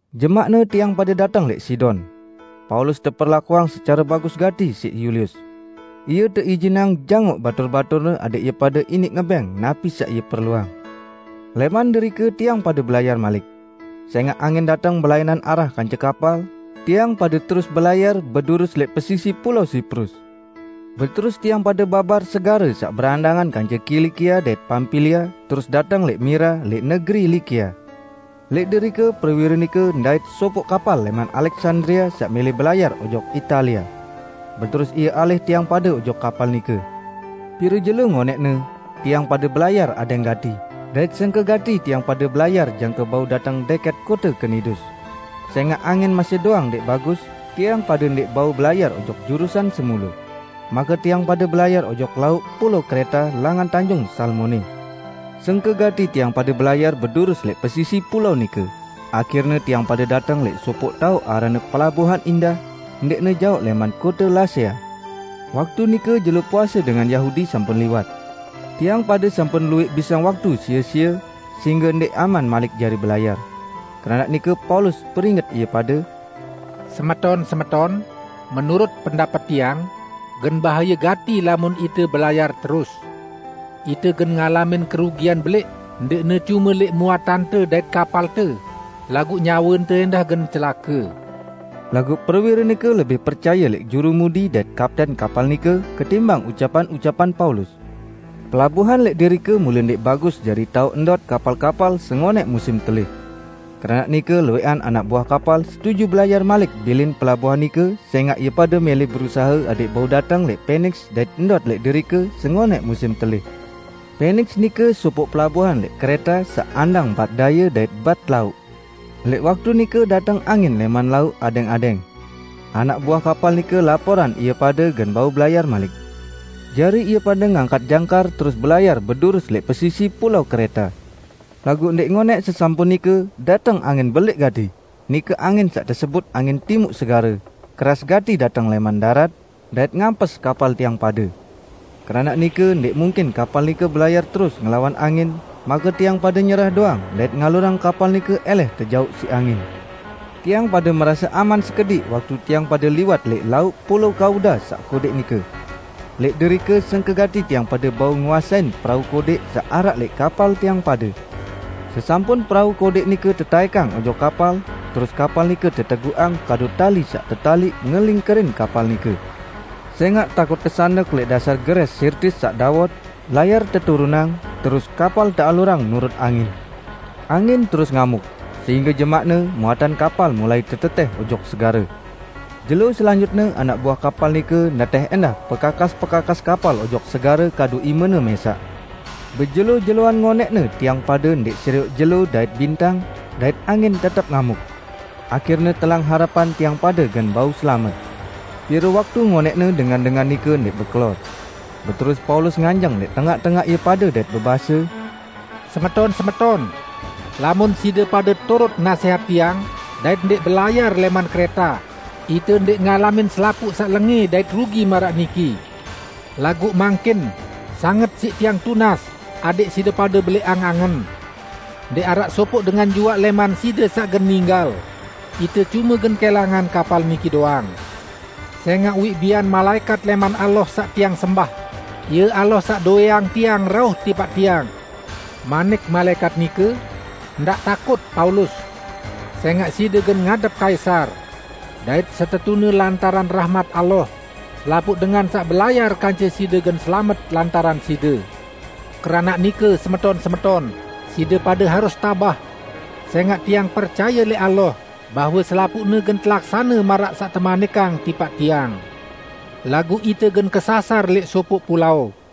Jemaqne tiang pade dateng lẽq Sidon. Paulus teperlakuang secare bagus gati siq Yulius. Ie teijinang jangoq batur-baturne adẽq ie pade iniq ngebẽng napi saq ie perluang. Lẽman derike tiang pade belayar malik. Sẽngaq angin dateng belainan arah kance kapal, tiang pade terus belayar bedurus lẽq pesisi pulao Siprus. Beterus tiang pade babar segare saq berandangan kance Kilikia dait Pampilia terus dateng lẽq Mira lẽq negeri Likia. Lẽq derike prewire nike ndait sopoq kapal lẽman Aleksandria saq mẽlẽ belayar ojok Italia. Beterus ie alih tiang pade ojok kapal nike. Pire jelo ngonẽqne, tiang pade belayar adẽng gati, dait sengke gati tiang pade belayar jangke bau dateng dẽkẽt kote Knidus. Sẽngaq angin masih doang ndẽq bagus, tiang pade ndẽq bau belayar ojok jurusan semule. Make tiang pade belayar ojok lauq pulao Kreta langan Tanjung Salmone. Sengke gati tiang pade belayar bedurus lẽq pesisi pulao nike, ahirne tiang pade dateng lẽq sopoq taoq aranne Pelabuan Indah, ndẽqne jaoq lẽman kote Lasea. Waktu nike Jelo Puase dengan Yahudi sampun liwat. Tiang pade sampun luwẽq bisang waktu sie-sie, sehingge ndẽq aman malik jari belayar. Keranaq nike Paulus peringet ie pade, "Semeton-semeton, menurut pendapet tiang, gen bahaye gati lamun ite belayar terus. Ite gen ngalamin kerugian belẽq ndẽqne cume lẽq muatante dait kapalte, laguq nyawente ẽndah gen celake." Laguq prewire nike lebih percaye lẽq jurumudi dait kapten kapal nike ketimbang ucapan-ucapan Paulus. Pelabuan lẽq derike mule ndẽq bagus jari taoq ndot kapal-kapal sengonẽq musim telih. Keranaq nike luwẽqan anak buah kapal setuju belayar malik bilin pelabuan nike sẽngaq ie pade mẽlẽ berusahe adẽq bau dateng lẽq Peniks dait ndot lẽq derike sengonẽq musim telih. Peniks nike sopoq pelabuan lẽq Kreta saq andang bat daye dait bat lauq. Lẽq waktu nike dateng angin lẽman lauq adẽng-adẽng. Anak buah kapal nike laporan ie pade gen bau belayar malik. Jari ie pade ngangkat jangkar terus belayar bedurus lẽq pesisi pulao Kreta. Laguq ndẽq ngonẽq sesampun nike, dateng angin belẽq gati -- nike angin saq tesebut angin Timuq Segare -- keras gati dateng lẽman darat, dait ngampes kapal tiang pade. Keranaq nike ndẽq mungkin kapal nike belayar terus ngelawan angin, make tiang pade nyerah doang dait ngalurang kapal nike ẽlẽh tejauq siq angin. Tiang pade merase aman sekediq waktu tiang pade liwat lẽq lauq pulao Kauda saq kodẽq nike. Lẽq derike sengke gati tiang pade bau nguasein perau kodẽq saq araq lẽq kapal tiang pade. Sesampun perau kodẽq nike tetaẽkang ojok kapal, terus kapal nike teteguqang kadu tali saq tetaliq ngelingkerin kapal nike. Sẽngaq takut kesandek lẽq dasar gerẽs Sirtis saq dawot, layar teturunang, terus kapal tealurang nurut angin. Angin terus ngamuk, sehingge jemaqne, muatan kapal mulai tetetẽh ojok segare. Jelo selanjutne anak buah kapal nike netẽh ẽndah pekakas-pekakas kapal ojok segare kadu imene mẽsaq. Bejelo-jeloan ngonẽqne tiang pade ndẽq serioq jelo dait bintang, dait angin tetep ngamuk. Ahirne telang harepan tiang pade gen bau selamet. Pire waktu ngonẽqne dengan-dengan nike ndẽq bekelor. Beterus Paulus nganjeng lẽq tengaq-tengaq ie pade dait bebase, "Semeton-semeton! Lamun side pade turut nasẽhat tiang dait ndẽq belayar lẽman Kreta, ite ndẽq ngalamin selapuq saq lengẽ dait rugi maraq niki. Laguq mangkin sanget siq tiang tunas adẽq side pade belẽqang angen. Ndẽq araq sopoq dengan juaq lẽman side saq gen ninggal; ite cume gen kẽlangan kapal niki doang. Sẽngaq uwiq bian malaẽkat lẽman Allah saq tiang sembah, Ie Allah saq dowẽang tiang, rauh tipaq tiang. Manik malaẽkat nike, 'Ndaq takut, Paulus! Sẽngaq side gen ngadep Kaisar. Dait setetune lantaran rahmat Allah, selapuq dengan saq belayar kance side gen selamet lantaran side.' Keranaq nike, semeton-semeton, side pade harus tabah! Sẽngaq tiang percaye lẽq Allah bahwe selapuqne gen telaksane maraq saq temanikang tipaq tiang. Laguq ite gen kesasar lẽq sopoq pulao."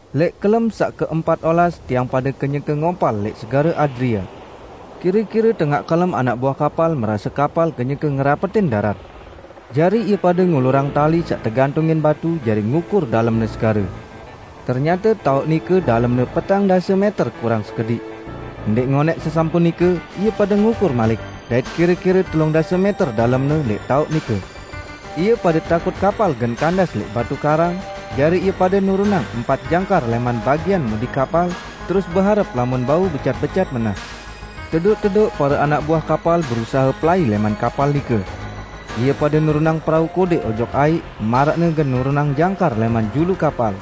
Lẽq kelem saq keempat olas tiang pade kenyeke ngompal lẽq Segare Adria. Kire-kire tengaq kelem anak buah kapal merase kapal kenyeke ngerapetin darat. Jari ie pade ngulurang tali saq tegantungin batu jari ngukur dalemne segare. Ternyate taoq nike dalemne petang dase mẽter kurang sekediq. Ndẽq ngonẽq sesampun nike, ie pade ngukur malik, dait kire-kire telung dase mẽter dalemne lẽq taoq nike. Ie pade takut kapal gen kandas lẽq batu karang, jari ie pade nurunang empat jangkar lẽman bagian mudi kapal, terus beharep lamun bau becat-becat menah. Tedoq-tedoq pare anak buah kapal berusahe pelai lẽman kapal nike. Ie pade nurunang perau kodẽq ojok aiq, maraqne gen nurunang jangkar lẽman julu kapal.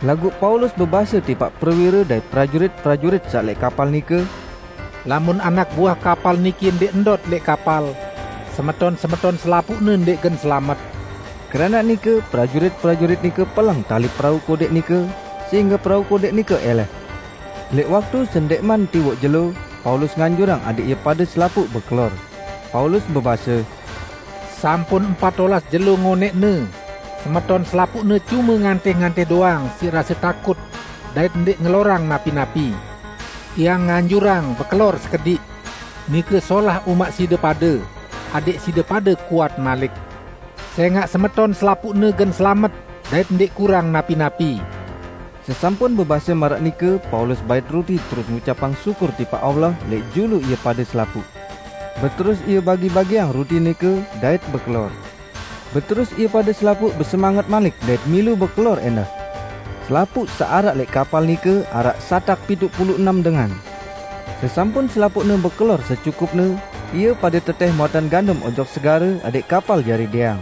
Laguq Paulus bebase tipaq prewire dait prajurit-prajurit saq lẽq kapal nike, "Lamun anak buah kapal niki ndẽq ndot lẽq kapal, semeton-semeton selapuqne ndẽq gen selamet." Keranaq nike, prajurit-prajurit nike peleng tali perau kodẽq nike, sehingge perau kodẽq nike ẽlẽh. Lẽq waktu sendẽqman tiwoq jelo, Paulus nganjurang adẽq ie pade selapuq bekelor. Paulus bebase, "Sampun empat olas jelo ngonẽqne semeton selapuqne cume ngantih-ngantih doang siq rase takut dait ndẽq ngelorang napi-napi. Tiang nganjurang, bekelor sekediq. Nike solah umaq side pade, adẽq side pade kuat malik. Sẽngaq semeton selapuqne gen selamet dait ndẽq kurang napi-napi." Sesampun bebase maraq nike Paulus bait ruti terus ngucapang syukur tipaq Allah lẽq julu ie pade selapuq. Beterus ie bagi-bagiang ruti nike, dait bekelor. Beterus ie pade selapuq besemanget malik dait milu bekelor ẽndah. Selapuq saq araq lẽq kapal nike araq satak pituq pulu enem dengan. Sesampun selapuqne bekelor secukupne, ie pade tetẽh muatan gandum ojok segare adẽq kapal jari dẽang.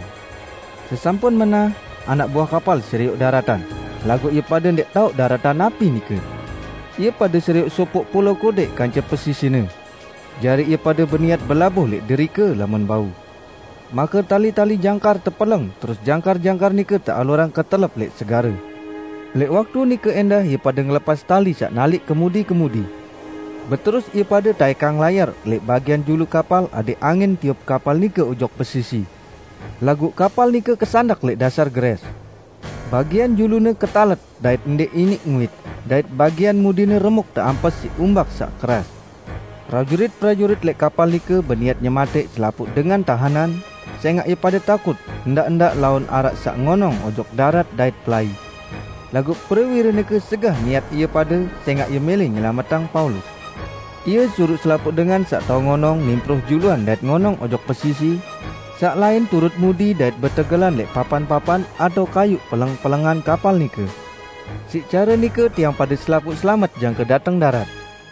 Sesampun menah, anak buah kapal serioq daratan, laguq ie pade ndẽq taoq daratan napi nike. Ie pade serioq sopoq pulao kodẽq kance pesisine. Jari ie pade beniat belabuh lẽq derike, lamun bau. Make tali-tali jangkar tepeleng terus jangkar-jangkar nike tealurang ketelep lẽq segare. Lẽq waktu nike ẽndah ie pade ngelepas tali saq naliq kemudi-kemudi. Beterus ie pade taẽkang layar lẽq bagian julu kapal adẽq angin tiup kapal nike ojok pesisi. Laguq kapal nike kesandek lẽq dasar gerẽs. Bagian julune ketalet dait ndẽq iniq nguit, dait bagian mudine remuk teampes siq umbak saq keras. Prajurit-prajurit lẽq kapal nike beniat nyematẽq selapuq dengan tahenan, sẽngaq ie pade takut ndaq-ndaq laun araq saq ngonong ojok darat dait pelai. Laguq prewire nike segah niat ie pade sẽngaq ie mẽlẽ nyelametang Paulus. Ie suruq selapuq dengan saq tao ngonong nimproh juluan dait ngonong ojok pesisi; saq lain turut mudi dait betegelan lẽq papan-papan atao kayuq peleng-pelengan kapal nike. Siq care nike tiang pade selapuq selamet jangke dateng darat.